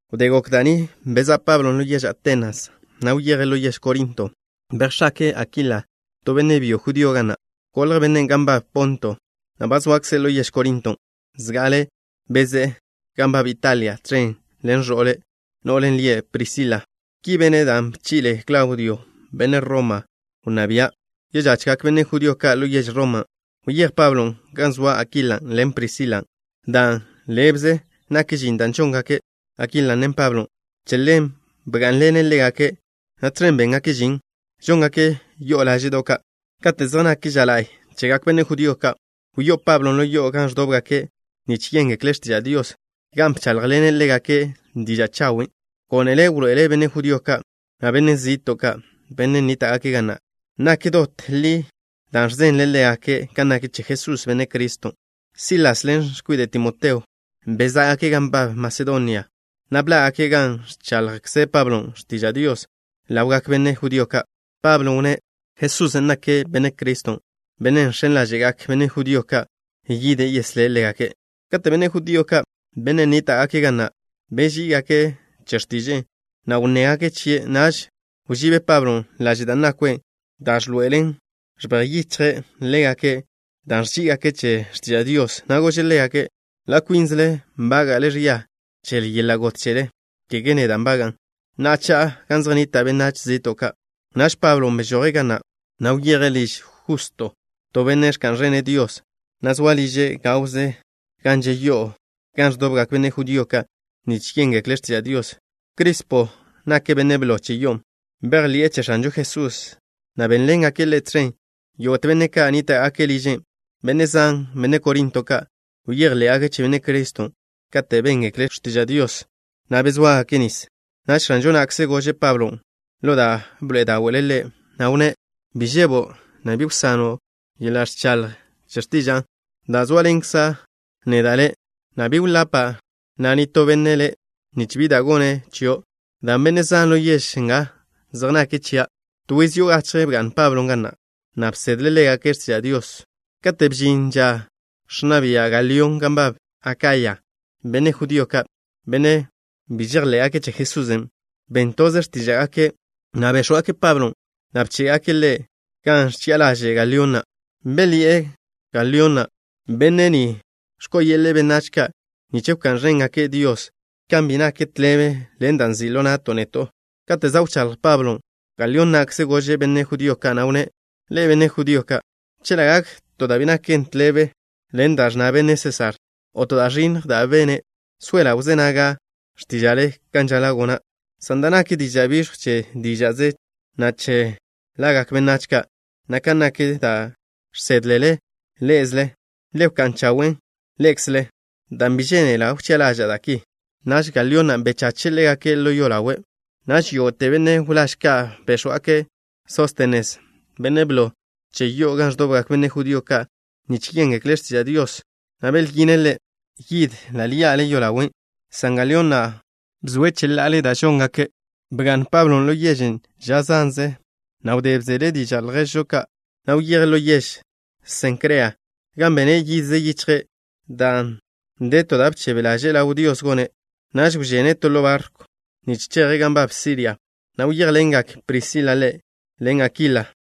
Wdé gok da' ni, bezá' Pablo ḻo yež Atenas, na' wyeje' ḻo yež Korinto. Bejx̱ake'e Akila, to benne' byo judío, ga na'. Golj bennen' gan nbab Ponto, na' ba zoakze' ḻo yež Korinton'. Zga'ale bezé'e gan nbab Italia tẕen ḻen ẕo'le', no'len' lie' Prisila. Ki bene' dan' bchi'le Klaudio, benne' Roma wnná bia', žojgak benne' judío ka' ḻo yež Roma. Wyéj Pablon' gan zoa Akilan' ḻen Prisilan'. Dan' ḻébeze nak žin da' žongak Akilan', na' Pablon', che ḻen bgá'nḻene' ḻégake', na' tẕen béngake' žin, žóngake' yo'o láže'do' ka'. Kate' zej nak ža la'y chegak benne' judío ka', wyó'o Pablon' ḻo yo'o gan ẕdóbgake' nich yéngekle' x̱tiža' Dios, gan bcháḻjḻene' ḻégake' diža' chawen'. Gónele' wḻoe'ele' benne' judío ka', na' benne' zi'to' ka', benne' nníta'gake' ga na', nak dot da' li da' ẕzenle' ḻégake' kan nak che Jesús, Benne' Criston'. Silas ḻen x̱kwide' Timoteo bezá'gake' gan nbab Masedonia, na' bḻá'gake' gan ẕchaḻjkze Pablon' x̱tiža' Dios ḻawgak benne' judío ka'. Pablon' wnné': —Jesusen' nake' Benne' Criston', Bennen' žx̱en ḻáže'gak benne' judío ka' yide' yeslé' ḻégake'. Kate' benne' judío ka', benne' nníta'gake' ga na', beží'igake' che x̱tiže'e, na' wnnégake' chie', naž wžíb Pablon' laže' da' nakwe', dan' ẕḻoe'elen ẕbej yichje' ḻégake' dan' ẕží'igake' che x̱tiža' Dios, na' gože' ḻégake': —Ḻa' kwínzele nbága'le ẕia che yeḻa' got chele, kege neda' nbaga'an. Na'a, cha'a gan zej nnita' benách zi'to' ka'. Naž Pablon' bežoje' ga na', na' wyeje' liž Justo, to benne' ẕka'n ẕene' Dios, na' zoa liže' gawze gan že' yo'o gan ẕdobgak benne' judío ka' nich yéngekle' x̱tiža' Dios. Crispo nake' benne' blo che yo'on'. Bejḻi'e che X̱anžo Jesús, na' bénḻengak ḻe' tẕen yógo'te benne' ka' nníta'gake' liže'. Benne' zan, benne' Korinto ka', bejḻé'gake' che Benne' Criston', katen' béngekle' x̱tiža' Dios, na' bezóagake' nis. Naž X̱anžon' na'kze gože' Pablon' ḻo da' bḻe'e dáwe'le', na' wnné': —Bi žebo', na' bi wsano' ẕchaḻjo' x̱tiža'a, dan' zóaḻenkza' neda' le', na' bi wḻapa' na' nitó benne' le' nich bi da' gone' chio', dan' benne' zan ḻo yež nga zej nake' chia'. To yiz yo'o gachje bga'n Pablon' ga na', na' bsedle' ḻégake' x̱tiža' Dios. Kate' bžin ža ẕnna bia' Galión gan nbab Akaya, benne' judío ka', benne' bi žejḻé'gake' che Jesusen', ben toze x̱tíža'gake', na' béx̱wgake' Pablon', na' bché'gake' ḻe' gan ẕchi'a ḻaže' Galión na'. Belyi'e Galión na': —Benne' ni ẕko'o yeḻe'e benách ka' nich wká'n ẕéngake' Dios, kan bi nak tḻebe ḻen da' nzi' ḻo na'to' neto'. Kate' za' wcháḻj Pablon', Galión na'kze gože' benne' judío ka', na' wnné': —Ḻe'e, benne' judío ka', chela' gak to da' bi nak tḻebe ḻen da' ẕnna benne' Sésar, o to da' ẕinnj da' bene', soela' wzé naga' x̱tíža'le kan žaḻa' gona', san dan' nak diža' biẕjw che díža'ze, na' che lagak benách ka', na' kan nak da' žsédlele ḻé'ezele, le wká'n chawen' ḻé'ekzele, dan' bi žénela' wchi'a ḻaža'a da' ki. Naž Galión na' bchache' ḻégake' ḻo yolawe'. Naž yógo'te benne' wláž ka' béx̱wgake' Sóstenes, benne' blo che yo'o gan ẕdobgak benne' judío ka' nich yéngekle' x̱tiža' Dios, na' belyine' ḻe' yid ḻa' ḻi'a yolawe', san Galión na' bzoe' cheḻa'ale da' žóngake'. Bga'n Pablon' ḻo yežen' ža zan, na' wdé bzele' diža' lježžo ka', na' wyeje' ḻo yež Senkrea, gan bene' yidze yichje', dan' de to da' bchebe ḻaže'e ḻaw Dios gone'. Naž wžene' to ḻo barkw, nich cheje' gan nbab Siria, na' wyéjḻengak Prisila ḻen Akila ḻe'.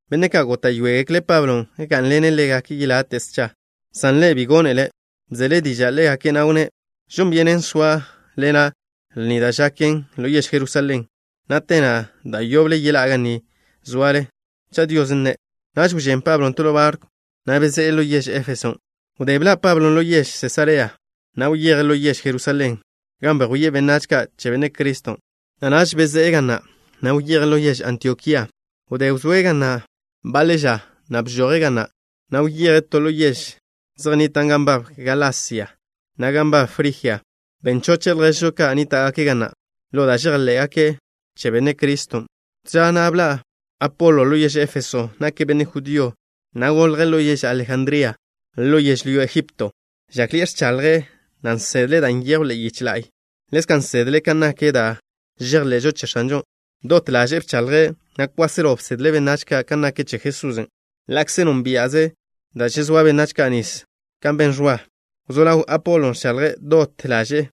Benne' ka' góta'yoegekle' Pablon' gá'nḻene' ḻégake' yelate' scha, san ḻe' bi gónele'. Bzele' diža' ḻégake', na' wnné': —Žon byenen soa' lena' lni da' za' gaken ḻo yež Jerusalén, na' te na' da' yoble yeḻá'a ga ni zoale, cha' Dios nne'. Naž wžén Pablon' to ḻo barkw, na' bezé'e ḻo yež Éfeson'. Wdé bḻa' Pablo ḻo yež Sesarea, na' wyeje' ḻo yež Jerusalén, gan bejwíe' benách ka' che Benne' Criston', na' naž bezé'e ga na', na' wyeje' ḻo yež Antiokía. Wdé wzóe' ga na' baḻe ža, na' bžoje' ga na', na' wyeje' to to yež ka' zej nnitan' gan nbab Galasia, na' gan nbab Frijia. Ben choche' lježžo ka' nníta'gake' ga na', ḻo da' žejḻé'gake' che Benne' Criston'. To ža na' bḻa' Apolo ḻo yež Éfeso. Nake' benne' judío, na' golje' ḻo yež Alejandría ḻo yežlyó Ejipto. Žákḻi'e ẕchaḻje', na' nsedle' da' nyejw ḻe'e yiche la'y. Ḻezka' nsedle' kan nak da' žejḻe'žo che X̱anžon'. Dot ḻaže'e bchaḻje', na' kwáselo bsedle' benách ka' kan nak che Jesusen', ḻa'kze nónbia'ze' da' žezóa benách ka' nis kan ben Ẕwa. Wzó ḻaw Apolon' ẕchaḻje' dot ḻaže'e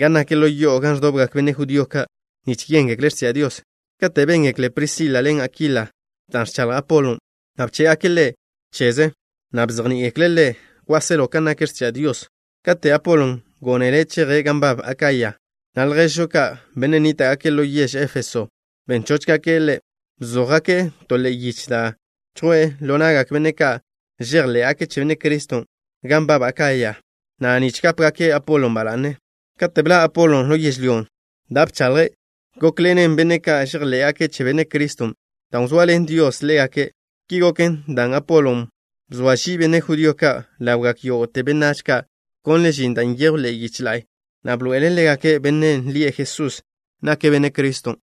gan nak ḻo yo'o gan ẕdobgak benne' judío ka' nich yéngekle' x̱tiža' Dios. Kate' béngekle Prisila ḻen Akila da' ẕchaḻj Apolon', na' bché'gake' ḻe' cheze, na' bzejní'igekle' ḻe' kwáselo kan nak x̱tiža' Dios. Kate' Apolon' gónele' cheje' gan nbab Akaya, na' lježžo ka', benne' nníta'gake' ḻo yež Éfeso, ben chóchgake' ḻe'. Bzójgake' to ḻe'e yiche da' chjwe'e ḻo na'gak benne' ka' žejḻé'gake' che Benne' Criston' gan nbab Akaya na', nich gápegake' Apolon' ba la'ne. Kate' bḻa' Apolon' ḻo yežlyón', da' bchaḻje' gókḻe'eḻenen benne' ka' žejḻé'gake' che Benne' Criston', dan' wzoaḻen Dios ḻégake'. Ki goken dan' Apolon' bzoa žie' benne' judío ka' ḻawgak yógo'te benách ka', bkonle' žin da' nyejw ḻe'e yiche la'y, na' bḻoe'ele' ḻégake' Bennen' lie' Jesús nake' Benne' Criston'.